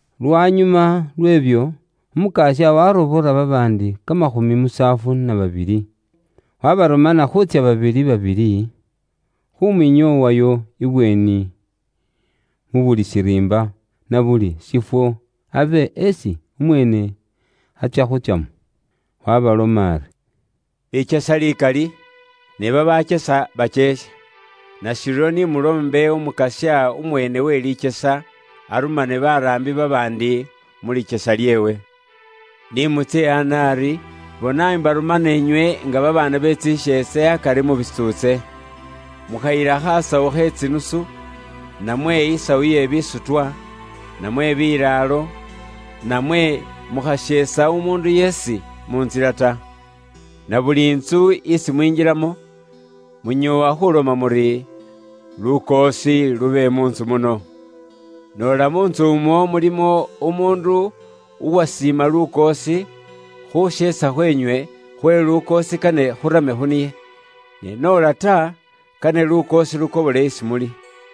Lwanyuma lw'ebyo, Umukasya waarobola babaandi kamakhumi musaafu na babili, waabarumana khuutsya babili, babili, khuumwinyoowayo ibweeni, mu buli shiriimba, na buli shifwo abe esi umweene atsya khuutsyamo. Waabaloma ari, “Likyesa likali, ne babaakyesa bakyeekhe. Nashiryo ni muloombe Umukasya umweene we likyesa arumane baraambi babaandi mu likyesa lyeewe. Ni mutsye ana ari, bona mbarumana inywe nga kamasheese kamaana akari mu bitsuutse. Mukhayila khasawu khe tsinusu, namwe isawu ye bisutwa, namwe bilaalo, namwe mukhasheesa umuundu yeesi mu ntsila ta. Na buli ntsu isi mwinjilamo, munyoowa khuloma muri, ‘Lukoosi lube mu ntsu muno.’ Noola mu ntsu umwo mulimo umuundu uwasiima lukoosi, khuusheesa khweenywe khwe lukoosi kane khurame khu niye. Ne noola ta, kane lukoosi lukobole isi muli.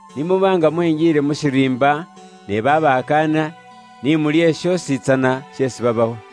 Ni muba nga mwenjiile mu shiriimba ne babakaanila, ni mulye shoositsana sheesi babawa.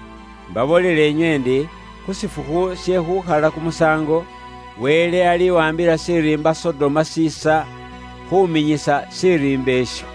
Mbaboolela inywe ndi, khu shifukhu she khuukhala kumusaango, Wele aliwaambila shiriimba Sodoma shiisa khuminyisa shiriimba isho.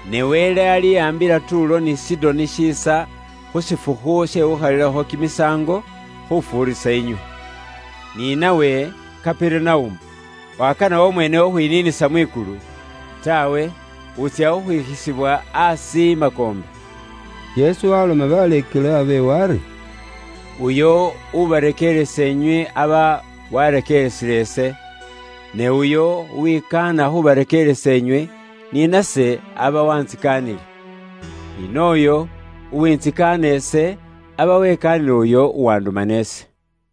Ne Wele aliwaambila Tuulo ni Sidoni shiisa khu shifukhu she khuukhalilakho kimisaango khufuurisa inywe. Ni nawe, Kaperunaumu, wakana wamweene khukhwiniinisa mwikulu? Taawe, wutsya khwikhisibwa aasi i makoombe.” Yesu waaloma baleekelwa beewe ari, “Uyo ubarekeeresa inywe aba warekeeresile ise, ne uyo uwikaana khuubarekeeresa inywe, ni nase aba waantsikaanile. Ni nooyo uwuntsikaana ise, aba wekaanile uyo uwanduma ise.”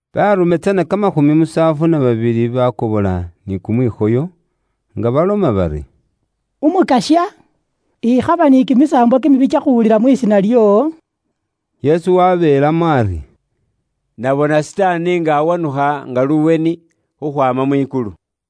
Baarume tsana kamakhumi musaafu na babili bakobola ni kumwikhoyo, nga baloma bari, “Umukasya, ikhaba ni kimisaambwa kimibi kyakhuwulila mu lisiina lyoowo.” Yesu wabeelamo ari, “Nabona Sitaani nga awanukha nga luweni, khukhwaama mwikulu.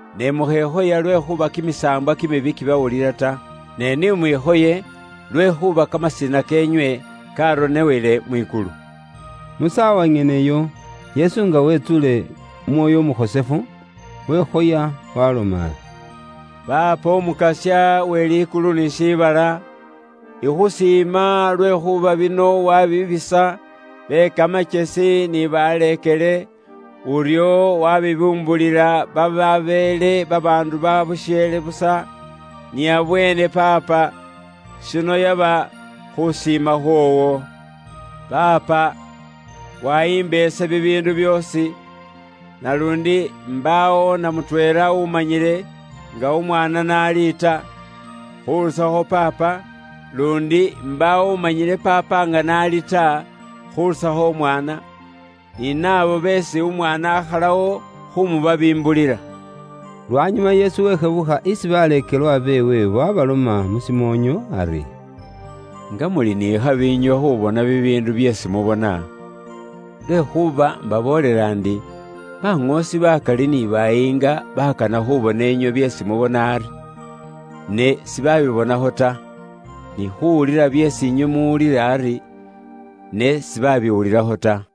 Ne mukhekhoya lwekhuuba kimisaambwa kimibi kibawulila ta, ne ni mwikhoye lwekhuuba kamasina keenywe karonewele mwikulu.” Mu saawa nyeneyo, Yesu nga wetsuule Umwoyo Umukhosefu, wekhoya, waaloma ari, “Paapa Umukasya we likulu ni shiibala, ikhusiima lwekhuuba bino wabibisa be kamakyesi ni baleekele, uryo wabibimbulila bababeele babaandu babusheele busa. Niabweene Paapa, shino yaba khusiima khwoowo. Paapa, wayimba ise bibiindu byoosi, naluundi imbaawo na mutweela umanyile nga umwaana n'ali ta, khurusakho Paapa, luundi imbaawo umanyile Paapa nga n'ali ta, khurusakho Umwaana, ni naabo beesi Umwaana akhalawo khumubabimbulila.” Lwanyuma Yesu weshebukha isi baleekelwa beewe waabaloma mu shimoonyo ari, “Nga muli ni khabi inywe khubona bibiindu byeesi mubona! Lwekhuuba mbaboolela ndi, baŋoosi bakali ni bayiinga baakana khubona inywe byeesi mubona ari, ne sibabibonakho ta, ni khuwulila byeesi inywe muwulila ari, ne sibaabiwulilakho ta.”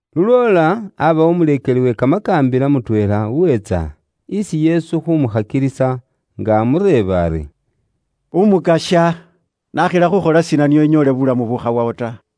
Lulwoola abaawo umuleekeli we kamakaambila mutweela uweetsa isi Yesu khumukhakilisa, nga amureeba ari, “Umukasya nakhila khukhola shiina nio inyoole buulamu bukhawawo ta?”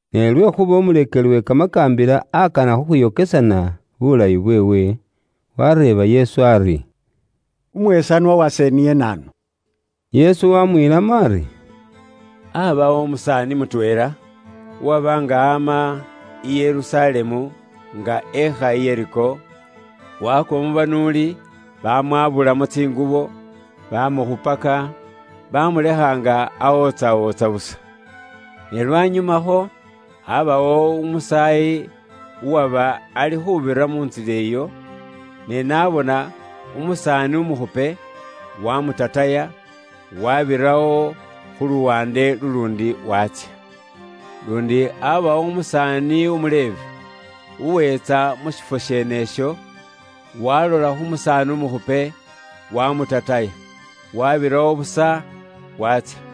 Ne lwekhuuba umuleekeli we kamakaambila akana khukhwiyokesana bulayi bweewe, wareeba Yesu ari, “Umwesanwa wase niye naanu?” Yesu wamwiilamo ari, “Aabawo umusaani mutweela, uwaba nga aama i Yerusalemu nga eekha i Yeriko, waakwa mu banuuli, baamwabulamo tsingubo, baamukhupaka, baamulekha nga awootsawootsa busa. Ne lwanyumakho, aabawo umusaayi uwaba ali khuubira mu ntsila iyo, ne n'abona umusaani umukhupe, waamutataya, waabirawo khu luwaande luluundi, waatsya. Luundi aabawo umusaani umu Levi, uweetsa mu shifwo sheenesho, waalola khu musaani umukhupe, waamutataya, waabirawo busa, waatsya.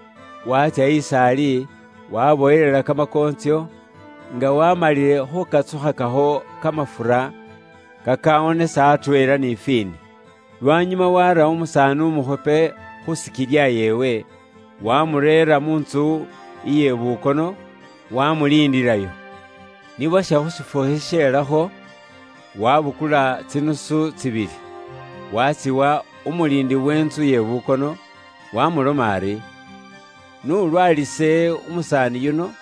waatsya is'ali, waabowelela kamakoontsyo, nga waamalile khuukatsukhakakho kamafura kakaawonesa atweela ni fiini. Lwanyuma waara umusaani umukhupe khu sikilya yeewe, waamureera mu ntsu iye bukono, waamuliindilayo. Ni bwasha khu shifukhu shisheelakho, waabukula tsidinari tsibili, waatsiwa umuliindi wentsu ye bukono, waamuloma ari, ‘N'ulwaalise umusaani yuno,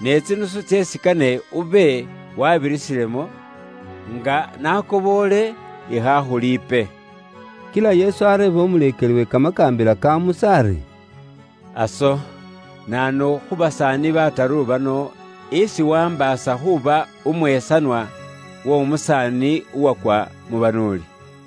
ne tsinusu tseesi kane ube waabirisilemo, nga nakoboole ikhaakhuliipe.’” Kila Yesu areeba umuleekeli we kamakaambila ka Musa ari, “Aso naanu khu basaani bataru bano, isi waambaasa khuuba umwesanwa w'omusaani uwakwa mu banuuli?”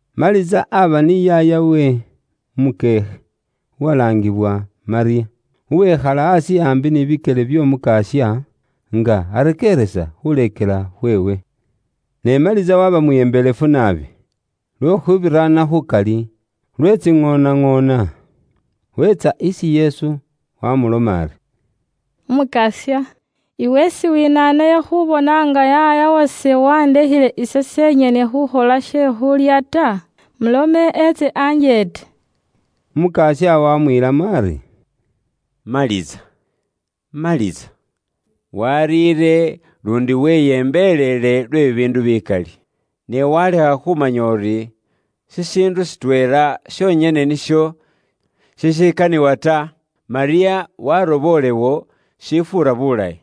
Maliza aba ni yaayawe umukyeekhe uwalaangiwa Malyamu, uwekhala aasi aambi ni bikyele by'Omukasya, nga arekeeresa khuleekela khweewe. Ne Maliza waba mwiyembelefu naabi, lwe khubiraana khukali, lwe tsiŋoonaŋoona. Weetsa isi Yesu wamuloma ari, “Umukasya iwe siwinaanayo khubona nga yaaya wase wandekheele ise senyene khukhola bubwakaanisi bwe she khulya ta? Mulome etse anjeete.” Umukasya wamwiilamo ari, “Maliza! Maliza! Wariire luundi weyembeleele lwe bibiindu bikali. Ne walekha khumanya uri, shishiindu shitweela shonyene nisho shishikaniwa ta; Malyamu warobolewo shifuura buulayi,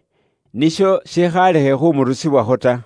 nisho shikhalekhe khumurusibwakho ta.”